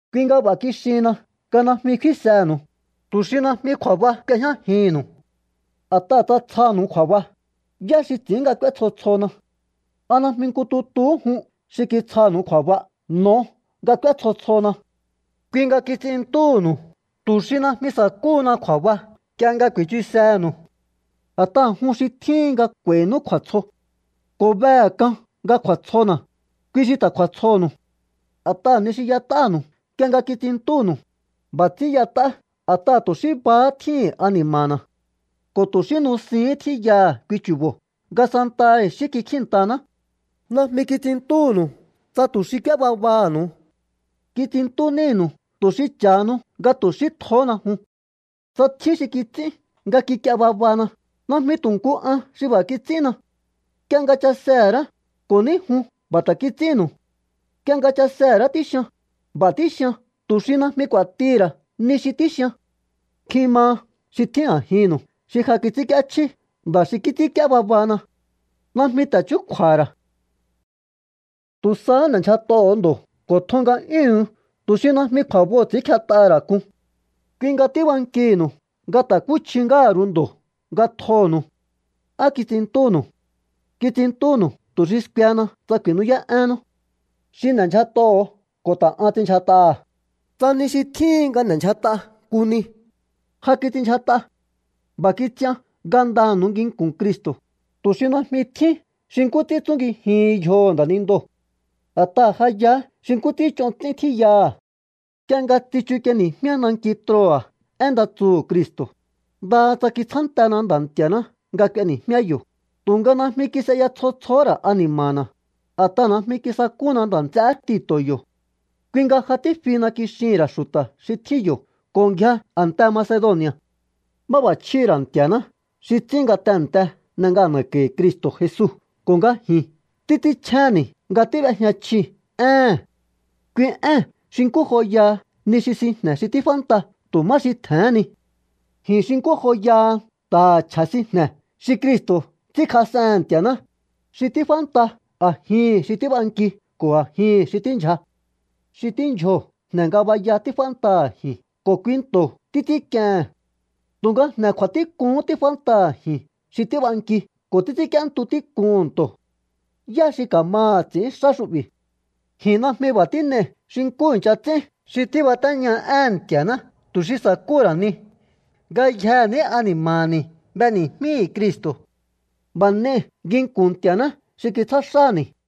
Kui nga b'a̱ kixihinna nga najmi kfínsenu̱u, tu̱ xi najmi kju̱a̱ba k'uejñájihi̱nnu̱u. A̱t'aha̱ tsa tsjanu̱u kju̱a̱ba, ¿yá xi ts'i̱ín nga k'úé tsjo tsjona? ¿A najmi nku tutuhú jun xi kitsjanu̱u kju̱a̱ba n'o̱o nga k'úé tsjo tsjona? Kui nga kits'inntúhu̱nu̱u tu̱ xi najmi sa̱kúhuna kju̱a̱ba nk'ie nga ku̱i̱chusehe̱nu̱u. A̱t'aha̱ jun xi tjíhin nga k'u̱a̱i̱nú kju̱a̱tsjo. Ko̱ behe̱ k'an nga kju̱a̱tsjona̱, kui xi ta̱ kju̱a̱tsjonu̱u. A̱t'aha̱ ni xi y'et'ánu̱u nk'ie nga kits'inntúnu̱u, b'a̱ ts'ín y'et'á a̱t'aha̱ tu̱ xí bahá tjíhi̱n ani̱ma̱na̱ ko̱ tu̱ xí nusihín tjíyaha̱ kui chu̱bo̱ nga santaha i̱xí kikjíi̱nntaná. Najmi kits'inntúnu̱u tsa tu̱ xi k'úé babaha̱nu̱u. Kits'inntú nínu̱u tu̱ xi cha̱hanu nga tu̱ xí tjohóna jun. Tsa tjín xi kits'ín nga kik'ie babana, najmi tu̱ nku an xi b'a̱ kits'ínna. Nk'ie nga chasehe̱ ra̱á, ko̱ ní jun b'a̱ ta̱ kits'ínnu̱u. Nk'ie nga chasehe̱ ra̱á tíxian, b'a̱ tíxian tu̱ xi najmi k'u̱a̱tihi̱ ra̱ ni xi tíxian. Nkjin maha xi tjín a̱jinnu̱u xi ja kits'ínk'íéchjí nda̱ xi kits'ínk'íé babana. Najmi ta̱ chúkju̱a̱ha̱ ra̱. Tu̱ sahá n'e̱ndyjat'oho̱o ndo̱ ko̱ tjon nga'yúhu̱un tu̱ xi najmi kju̱a̱boo̱ ts'i̱ínkjet'aha̱ ra̱ k'un. Kui nga tíbankihi̱nu̱u nga ta̱kúchji ngáha̱ ru̱u ndo̱ nga tjonu̱u. ¿Á kits'inntúhu̱nu̱u? Kits'inntúnu̱u tu̱ xi skuehena tsa ku̱i̱nú'yá'énnú. Xi n'e̱ndyjat'oho̱o ko̱ ta̱ an ts'inndyjat'aha̱. Tsa ni xi tjíhin nga n'e̱ndyjat'a nku ni, ja kits'inndyjat'a. B'a̱ kits'ian ngandanu̱u nginku̱n Cristo̱, tu̱ xi najmi tjín xi nkú ts'ín tsungijihin yjoho̱ nda̱nindoo̱. A̱t'aha̱ ja yaá xi nkú ts'ín ch'on ts'ín tjíyaha̱. Nk'ie nga tsichuk'ieni̱jmíá nanki Troa̱ én nda tsuhu̱ Cristo̱, ndaha tsa kitsjántena Nda̱ Nti̱a̱ná nga k'ueni̱jmíá yo̱, tu̱nga najmi kis'eya tsjo tsjohó ra̱ ani̱ma̱na̱, a̱t'aha̱ najmi kisakúna nda̱ nts'eé Tito̱ yo̱. Kui nga “ja tífihina”, kixihi̱n ra̱ xu̱ta̱ xi tjín yo̱ ko̱ ngjia a̱nte Macedoni̱a̱. Máb'a̱chjíhi̱ ra̱ Nti̱a̱ná xi ts'ín nga tehe̱nte n'e ngana̱ko̱i̱ Cristo̱ Jesu ko̱ nga ji̱n títs'ínchjénni̱ nga tíb'éjña chji éhe̱n. Kui ée̱n xi nkú joyaha ni xi sinjne̱ xi tíf'ánta tu̱ má xi tje̱hén ni. Ji̱n xi nkú joyaha nta̱ha̱ chje̱ sinjne̱ xi Cristo̱ ts'ínkjas'ehe̱n Nti̱a̱ná, xi tíf'ánta a̱jihi̱n xi tíb'anki ko̱ a̱jihi̱n xi tíndyja. Xi tíndyjoo̱ jne̱ ngabaya tíf'ántaha̱ ji̱n ko̱ kui nto̱ títs'ínk'iehe̱n. Tu̱nga jne̱ kju̱a̱tík'uhún tíf'ántaha̱ ji̱n xi tíb'anki ko̱ títs'ínk'íéntu tík'uhu̱n nto̱. ¿Yá xi ka̱maha̱ ts'i̱ín xá xu'bi̱? Ji̱n najmi b'a̱ tín'ei̱ xi nkú i̱ncha ts'ín xi tíbatéña éhe̱n Nti̱a̱ná tu̱ xi sa̱kúhu̱ ra̱ ni. Ngayjehe̱ ní ani̱ma̱ni̱ b'eni̱jmíi̱ Cristo̱. B'a̱ n'ei̱ nginku̱n Nti̱a̱ná xi kitsjá xáni̱.